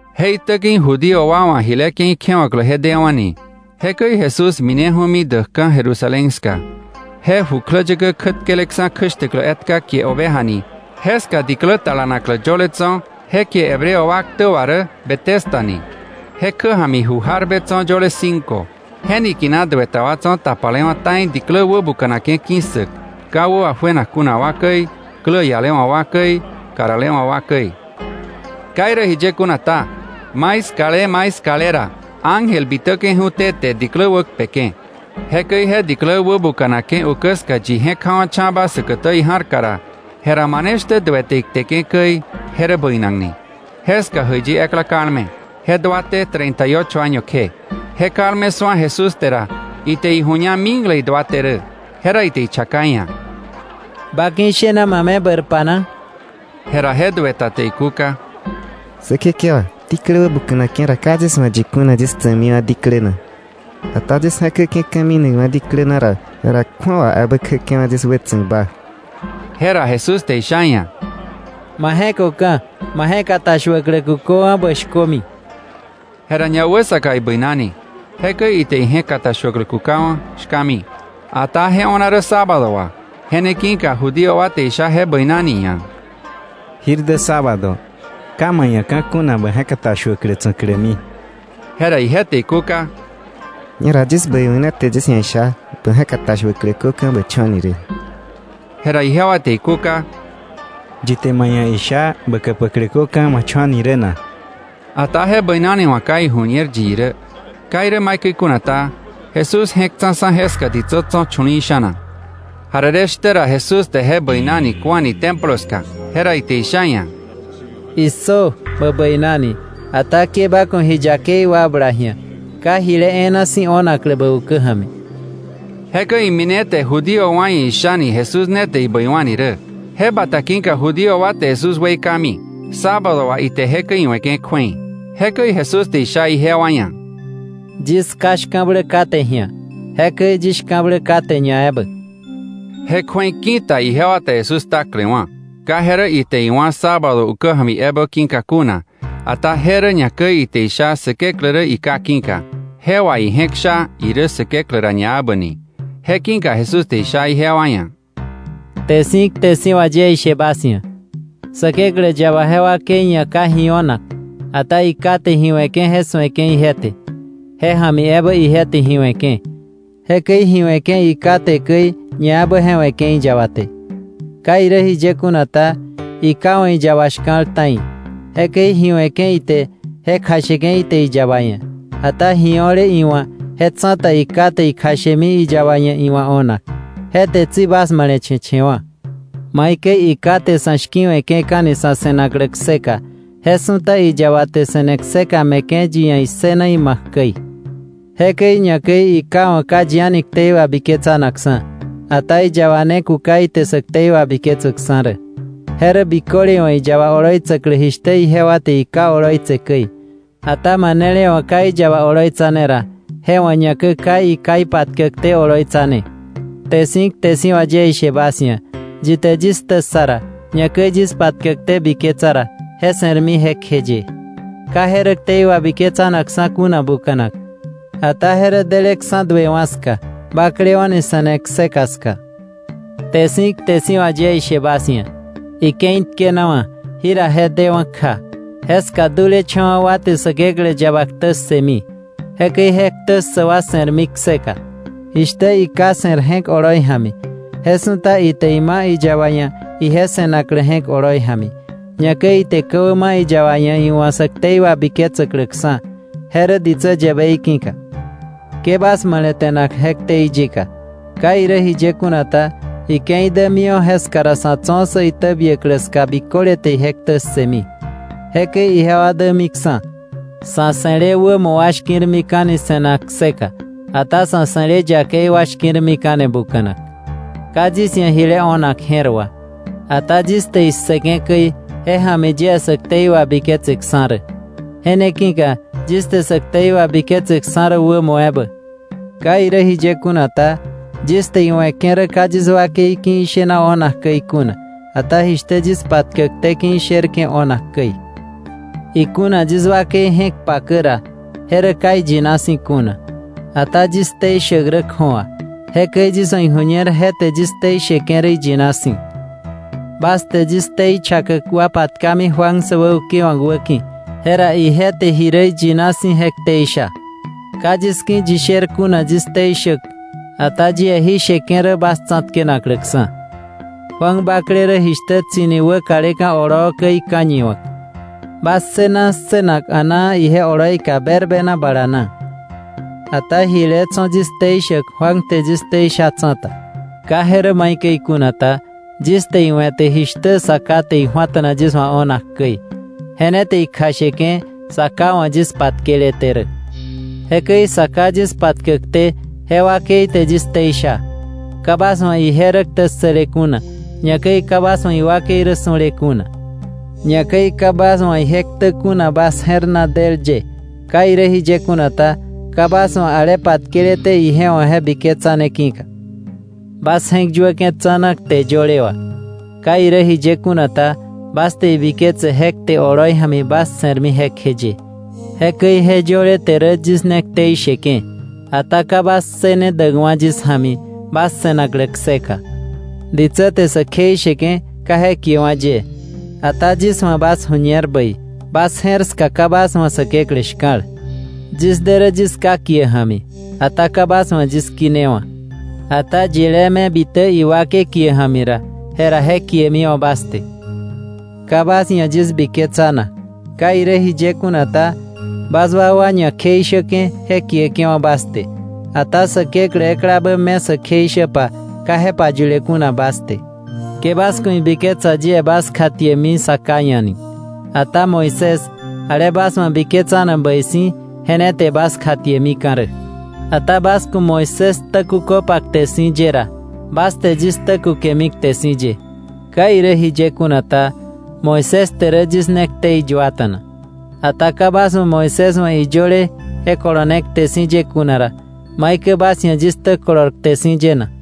Je itä ki̱ Judío wa wa̱ jile ke̱i kjewa̱klä je dewa̱ni. Jekäi Jesús mineju̱mi däkka̱ Jerusalén ska. Je jukläyäkä kjätkeleksa̱ kjäshtäklä etka kie Oveja ni, jeska diklä talanaklä yöle tso̱ je kie Hebreo wa ktä wà rä Betesda ni. Je kjä ja̱mi ju jarbe tso̱ yöle cinco. Je niki̱na duë ta wa tso̱ tapalewa̱ ta̱i diklä wäbuka̱nake̱ ki̱ssäk: ka wä wajuenak kuna wa käi, klä ialewa̱ wa käi, karalewa̱ wa käi. Ka irä jiye kuna ta, maiskale maiskale ra, ángel bitäke̱ju̱té te diklä wäkpeke̱. Jekäi je diklä wäbuka̱nake̱ ukä ska yi je̱k ja̱wa̱cha̱ba säkätä ija̱rka ra, jera mane shtä duë te ikteke̱ käi je rä bäinakni. Jeska jäiyi ekla kalme. Je duaté treinta y ocho año kje. Je kalme su̱a Jesús te ra, ite iju̱ña mikle iduaté rä. Jera ite ichaka iia̱: —¿Ba ki̱ ishena ma me bäirpa na? Jera je duë ta te ikúka: —Säkekewa, diklä wäbuka̱nake̱ ra ka yis wa̱ yi kuna yis tsa̱kmiwa̱ diklä na, ata yis je̱käke̱ka̱ minakwa̱ diklä na ra, jera kju̱awa ebä kjäke̱wa̱ yis wätsa̱kba. Jera Jesús te isha iia̱: —Ma je̱köka̱, ma je̱katashuäklä kuköwa̱, bä shkömi. Jera ñawäsaka ibäinani. Jekäi ite ije̱katashuäklä kukawa̱, shkami. Ata je o̱na rä sábado wà. Je ne ki̱ka Judío wa te isha je bäinani ia̱: —Jir dä sábado. Ka ka̱ kuna bä je̱katashuäklä tsa̱klämi. Jera ije te ikúka: —Ñera yis bäiwa̱k ne te yis ia̱ isha: ‘Bä je̱katashuäklä köka̱, ma cho̱ ni rä.’ Jera ijewa te ikúka: —¿Yi te ma ia̱ isha: ‘Bä käpäklä köka̱, ma cho̱’ ni rä na? Ata je bäinani wa̱ ka iju̱ñer yi irä. Ka irä maikäi kuna ta, Jesús je̱k tsa̱ksa̱ jeska ditsä tso̱ chu̱li̱i̱ sha̱na. Jarere shtä ra Jesús te je bäinani ku̱ani Templo ska. Jera ite isha iia̱: —Issö, bä bäinani, ata ke ba ku̱ ji yakei wakbla ji̱a, ka jile e̱e̱na si̱ o̱naklä bä ukä ja̱mi. Jekäi imine te Judío wa ia̱ ishani Jesús ne te ibäiwa̱ni rä. Je bata ki̱ka Judío wa te Jesús weikami, sábado wà ite jekäi iwe̱ke̱ kju̱ei. Jekäi Jesús te isha ijewa ia̱: —Yis Ká shka̱blä kate ji̱a. Jekäi yis shka̱blä kate ñaebä. Je kju̱ei ki̱ta ijewa te Jesús ktaklewa̱. Ka je rä ite iwá̱ sábado ukä ja̱mi ebä ki̱ka kuna, ata je rä ñakäi ite isha Säkeklä rä iKá ki̱ka. Je wà ije̱k sha irä Säkeklä ra ñaebä ni. Je ki̱ka Jesús te isha ijewa ia̱: “Kte si̱ kte si̱ wà yie ishe bas ia̱, Säkeklä yaba je wakei ia̱ ka ji o̱nak, ata iKá te ji we̱ke̱ je su̱eke̱ ije te, je ja̱mi ebä ije te ji we̱ke̱. Jekäi ji we̱ke̱ iKá te käi, ñaebä je we̱ke̱ iyaba te. Ka irä jiye kuna ta, iKá wa̱ iyaba shka̱l ta̱i. Jekäi ji we̱ke̱ ite je kjasheke̱ ite iyaba ia̱. Ata ji o̱le iwa̱ je tsa̱ta iKá te ikjashemi iyaba ia̱ iwa̱ o̱nak. Je te tsi bas male̱che̱che̱wa̱. Maikäi iKá te sa̱ shki̱we̱ke̱ka̱ni sa̱ se̱naklä kseka je su̱ta iyaba te se̱ne kseka me̱ke̱ yi ia̱ issëna ima̱k käi. Jekäi ñakäi iKá wa̱ ka yi a̱ni ktei wabiketsanakksa̱, ata iyaba ne kuka ite sä ktei wabiketsäkksa̱ rä. Je rä biköle wa̱ iyaba oloitsäklä jishtä ijewa te iKá oloitse käi. Ata manele wa̱ ka iyaba oloitsane ra, je wa̱ ñakäi ka iKá ipatkäkté oloitsane. “Kte si̱ kte si̱ wà yie ishe bas ia̱: Yi te yis ktä ssa ra, ñakäi yis patkäkté biketsa ra, je se̱rmi jekjeye. Ka je rä ktei wabiketsanakksa̱ kuna buka̱nak, ata je rä deleksa̱ duewa̱ ska, baklewa̱ni se̱ne kseka ska. Kte si̱ kte si̱ wà yie ishe bas ia̱, ike̱i tkenawa̱, jira je dewa̱ kja, jeska dulecha̱wa̱ wa te Säkeklä yaba ktä ssëmi. Jekäi je ktä ssäk wa se̱rmi kseka. Jishtä iKá se̱r je̱k oloi ja̱mi, je su̱ta ite ima̱ iyaba ia̱ ije se̱naklä je̱k oloi ja̱mi. Ñakäi ite ka̱wä ma̱ iyaba ia̱ iwa̱ sä ktei wabiketsäkläksa̱, je rä ditsä yäbei ki̱ka. Ke bas male̱te̱na je ktei yika. Ka irä jiye kuna ta, ike̱i dämiwa̱ jeska ra sa̱ tso̱ sä itäbiäklä ska biköle te ije ktä ssëmi. Jekäi ijewa dämiksa̱. Sa̱ se̱le wämo wa shki̱rmika̱ni se̱nak kseka; ata sa̱ se̱le yakei wa shki̱rmika̱ni buka̱nak. “Ka yis ia̱ jile o̱nak je̱r wà. Ata yis te issëke̱ käi, je ja̱mi yie sä ktei wabiketseksa̱ rä. Je ne ki̱ka yis te sä ktei wabiketseksa̱ rä wämo ebä. Ka irä jiye kuna ta, yis te iwe̱ke̱ rä ka yis wakei ki̱ ishene o̱nak käi kuna, ata jishtä yis patkäkté ki̱ isherke̱ o̱nak käi. Ikuna yis wakei je̱k pakä ra, je rä ka iyina si̱ kuna. Ata yis ktei shäk rä kju̱awa. Jekäi yis wa̱ iju̱ñer je te yis ktei sheke̱ rä iyina si̱. Bas te yis ktei chakäk wa patkami Juan säwäukewa̱k wäki̱, jera ije te ji rä iyina si̱ je ktei sha. Ka yis ki̱ yi sher kuna yis ktei shäk, ata yie jí sheke̱ rä bas tsa̱tkenakläksa̱. Juan bakle rä jishtä tsi̱ni wäkaleka̱ oloo käi ka̱ñiwa̱k. Bas ssëna ssënak a̱naa ije oloika berbena bala na. Ata jile tso̱ yis ktei shäk Juan te yis ktei sha tsa̱ta. ¿Ka je rä maikäi kuna ta? Yis te iwe̱te jishtä Sa Ká te iju̱ata̱na yis wa̱ o̱nak käi, je ne te ikjasheke̱ Sa Ká wa̱ yis patkeleté rä. Jekäi Sa Ká yis patkäkté, je wakei te yis ktei sha. Ka bas wa̱ ije rä ktä ssële kuna; ñakäi ka bas wa̱ iwakei rä su̱le kuna. Ñakäi ka bas wa̱ ije ktä kuna bas je̱r na del ye. Ka irä jiye kuna ta, ka bas wa̱ ale patkeleté ije wa̱ je biketsane ki̱ka. Bas je̱k yuäke̱ tsa̱na kte yöle wà. Ka irä jiye kuna ta, bas te ibiketse je kte oloi ja̱mi bas se̱rmi jekjeye. Jekäi je yöle te yis ne ktei sheke̱ rä. Ata ka bas ssëne däkwa̱ yis ja̱mi bas se̱naklä kseka. “Ditsä te sä kjeisheke̱, ka je kiewa̱ yie. Ata yis wa̱ bas ju̱ñer bäi bas je̱r ska ka bas wa̱ Säkeklä shka̱l. Yis de rä yis Ká kie ja̱mi, ata ka bas wa̱ yis kinewa̱, ata yilé me bitäk iwakei kie ja̱mi ra, jera je kiemiwa̱ bas te. Ka bas ia̱ yis biketsanak. Ka irä jiye kuna ta, bas wakwa ñakjeishäke̱ je kieke̱wa̱ bas te, ata Säkeklä eklabä me sä kjeishäpa, ka je payule kuna bas te. Ke bas ku̱ ibiketsa yie bas kjatiemi Sa Ká ia̱ ni. Ata Moisés, ale bas wa̱ biketsanak bäi si̱, je ne te bas kjatiemika̱ rä. Ata bas ku̱ Moisés ktä kuköpa kte si̱ ye ra, bas te yis ktä kukemi kte si̱ ye. Ka irä jiye kuna ta, Moisés te yis ne ktei yuata̱na rä. Ata ka bas wa̱ Moisés wa̱ iyöle je kolone kte si̱ ye kuna ra, ¿maikäi bas ia̱ yis ktä kolor kte si̱ ye na?”